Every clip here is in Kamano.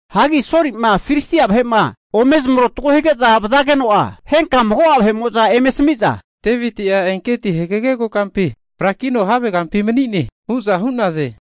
Hagi Soli'ma Filistia vahe'ma ome zamarotago hige'za vazageno'a, henka mago'a vahe'mo'za eme asami'za, Deviti'a Engedi hagege kokampi frakino havegampi mani'ne hu'za hu'naze.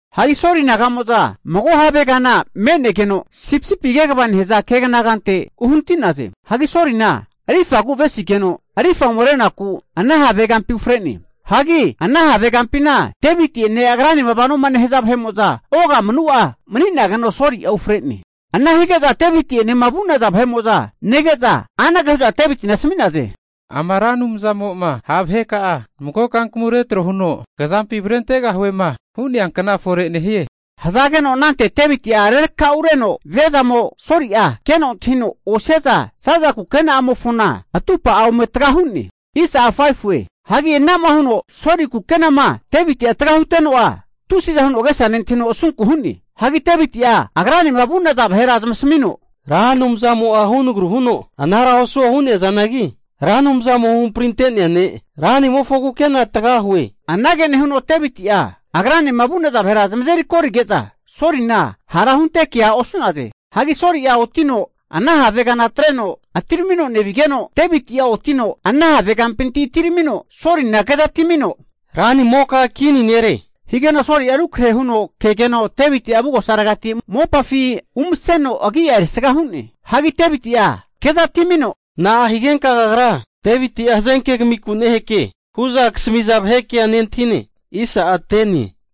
Hagi Soli naga'mo'za mago havegana me'negeno sipisipi kegava nehaza keganagante uhanati'naze. Hagi Solina rifagu avesigeno, arifa ome renaku ana have kampi ufre'ne. Hagi ana have kampina Deviti'ene agranema vanoma nehaza vahe'mo'za ogamanu'a mani'nageno Soli'a ufre'ne. Ana hige'za Deviti'enema vu'naza vahe'mo'za nege'za anage hu'za Devitina asami'naze, Ama Ra Anumzamo'ma ha' vaheka'a mago kankamu retro huno kazampi avrentegahuema hu'nea kna fore nehie. Hazageno anante Deviti'a rerakaureno viazamo, Soli'a keno antahino osiaza, zaza kukena'amofona atupa'a ome taga hu'ne. Hagi anama huno Soli kukenama Deviti'a taga huteno'a, tusiza huno agesa nentahino asunku hu'ne. Hagi Deviti'a agranema vu'naza vahera zamasamino, Ra Anumzamo'a hunagru huno anara osuo hu'neazanagi, Ra Anumzamo huhamprinte'nea ne' ranimofo kukena tagahue. Anage nehuno Deviti'a agranema vu'naza vahera zamazeri korige'za, Solina hara hunte kea osu'naze. Hagi Soli'a otino ana havegana atreno atiramino nevigeno, Deviti'a otino ana have kampinti atiramino Solina kezatimino, ranimoka kini nere, higeno Soli'a rukrahe huno kegeno Deviti'a avugosaregati mopafi umaseno agi'a erisga hu'ne. Hagi Deviti'a keza atimino, Na'a higenka kagra Deviti'a hazenke kamiku neheke hu'za kasamiza vahe kea nentahine?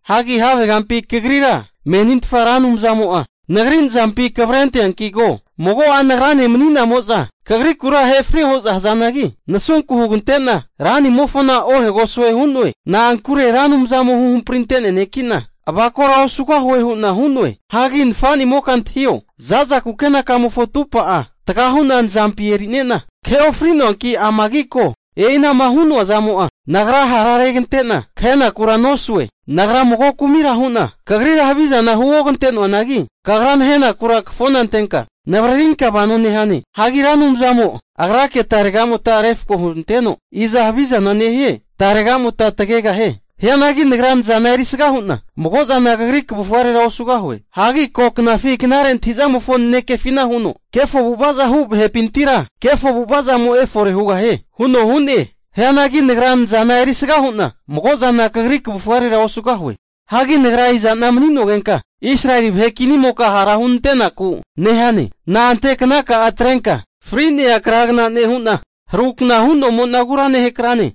Hagi havegampi kagrira menintfaza Ra Anumzamo'a nagri nazampina kavrenteanki ko. Mago'a nagrane mani'namo'za kagrikura ahefrio hu'za hazanagi, nasunku hugantena, ranimofona ohegosue hu'noe. Na'ankure Ra Anumzamo huhamprinte'nea neki'na avakora osugahue hu'na hu'noe. Hagi nafanimoka antahio, zaza kukenakamofo atupa'a taga hu'na nazampi e'nerina kahe ofri'noanki ama ko. E'inama hu'noa zamo'a nagra hararegante'na kahenakura nosue. Nagra mago kumira hu'na kagrira havizana huogante'noanagi, kagra nahenakura kafona antenka navaririnka vano nehane. Hagi Ra Anumzamo agrake taregamota'a refako huranteno, iza havizana nehie taregamota tagegahie. Hianagi nagra nazana erisga hu'na mago'zana kagri kavufarera osugahue. Hagi koknafi knare antahi'zamofo nanekefina huno, kefo avu'vaza hu vahepintira kefo avu'avazamo efore hugahie huno hu'ne. Hianagi nagra nazana erisga hu'na mago'zana kagri kavufarera osugahue. Hagi nagra iza'na mani'nogenka, Israeli vahe kinimoka hara hunante'naku nehane? Na'ante knaka'a atrenka fri'nea kragna nehu'na, harukna hu'nomonagura nehakrane?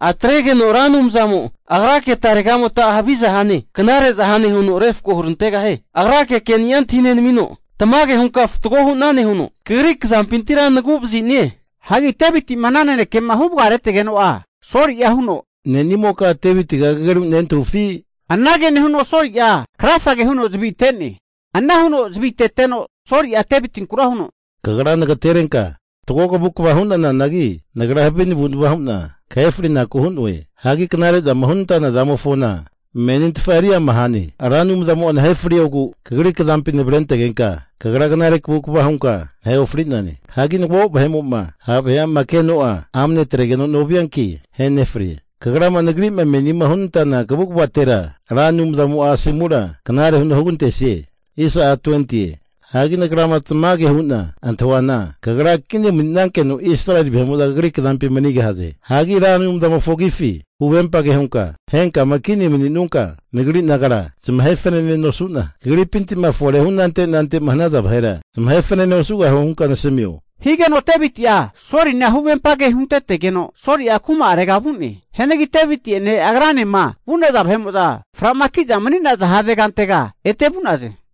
Atregeno Ra Anumzamo Agrake taregamota'a haviza hane, knare'za hane huno refko hurantegahie. Agrake ke'ni'a antahinenamino, tamage hunka fatgo hunane huno kagri kazampintira nagu'vazi'nie. Hagi Deviti'ma ana nanekema huvaretegeno'a Soli'a huno, ne'nimoka Devitiga kageru nentahufi? Anage nehuno Soli'a krafage huno zavi ate'ne. Ana huno zaviteteno Soli'a Devitinkura huno, Kagra nagaterenka fatgo kavukava hu'nananagi, nagra havi navu'nava hu'na kahe frinaku hu'noe. Hagi knare zama hunenantana zamofona menintfa eri ama hane. Ra Anumzamo'a nahe friogu kagri kazampima navrentegenka knare kavukava hunka nahe ofri'nane. Hagi mago vahe'mo'ma ha' vahe'ama keno'a amane atregeno novianki ahenefrie. Hagi kagrama nagri'ma menima hunantana kavukavatera Ra Anumzamo asomura knare huno hugantesie. Hagi nagrama tamage hu'na antahuana kagra kini mani'nankeno, Israeli vahe'mo'za kagri kazampi manigahaze. Hagi Ra Anumzamofo agifi huvempage hunka, henkama kini mani'nunka nagri nagara zamahe fanene nosu'na, kagripinti'ma fore hu anante anante'ma hanaza vahera zamahe fanane osugahue hunka nasamio. Higeno Deviti'a Solina huvempage huntetegeno, Soli'a kuma'arega vu'ne. Hianagi Deviti'ene agranema vu'naza vahe'mo'za fra'maki'za mani'naza havegantega ete vu'naze.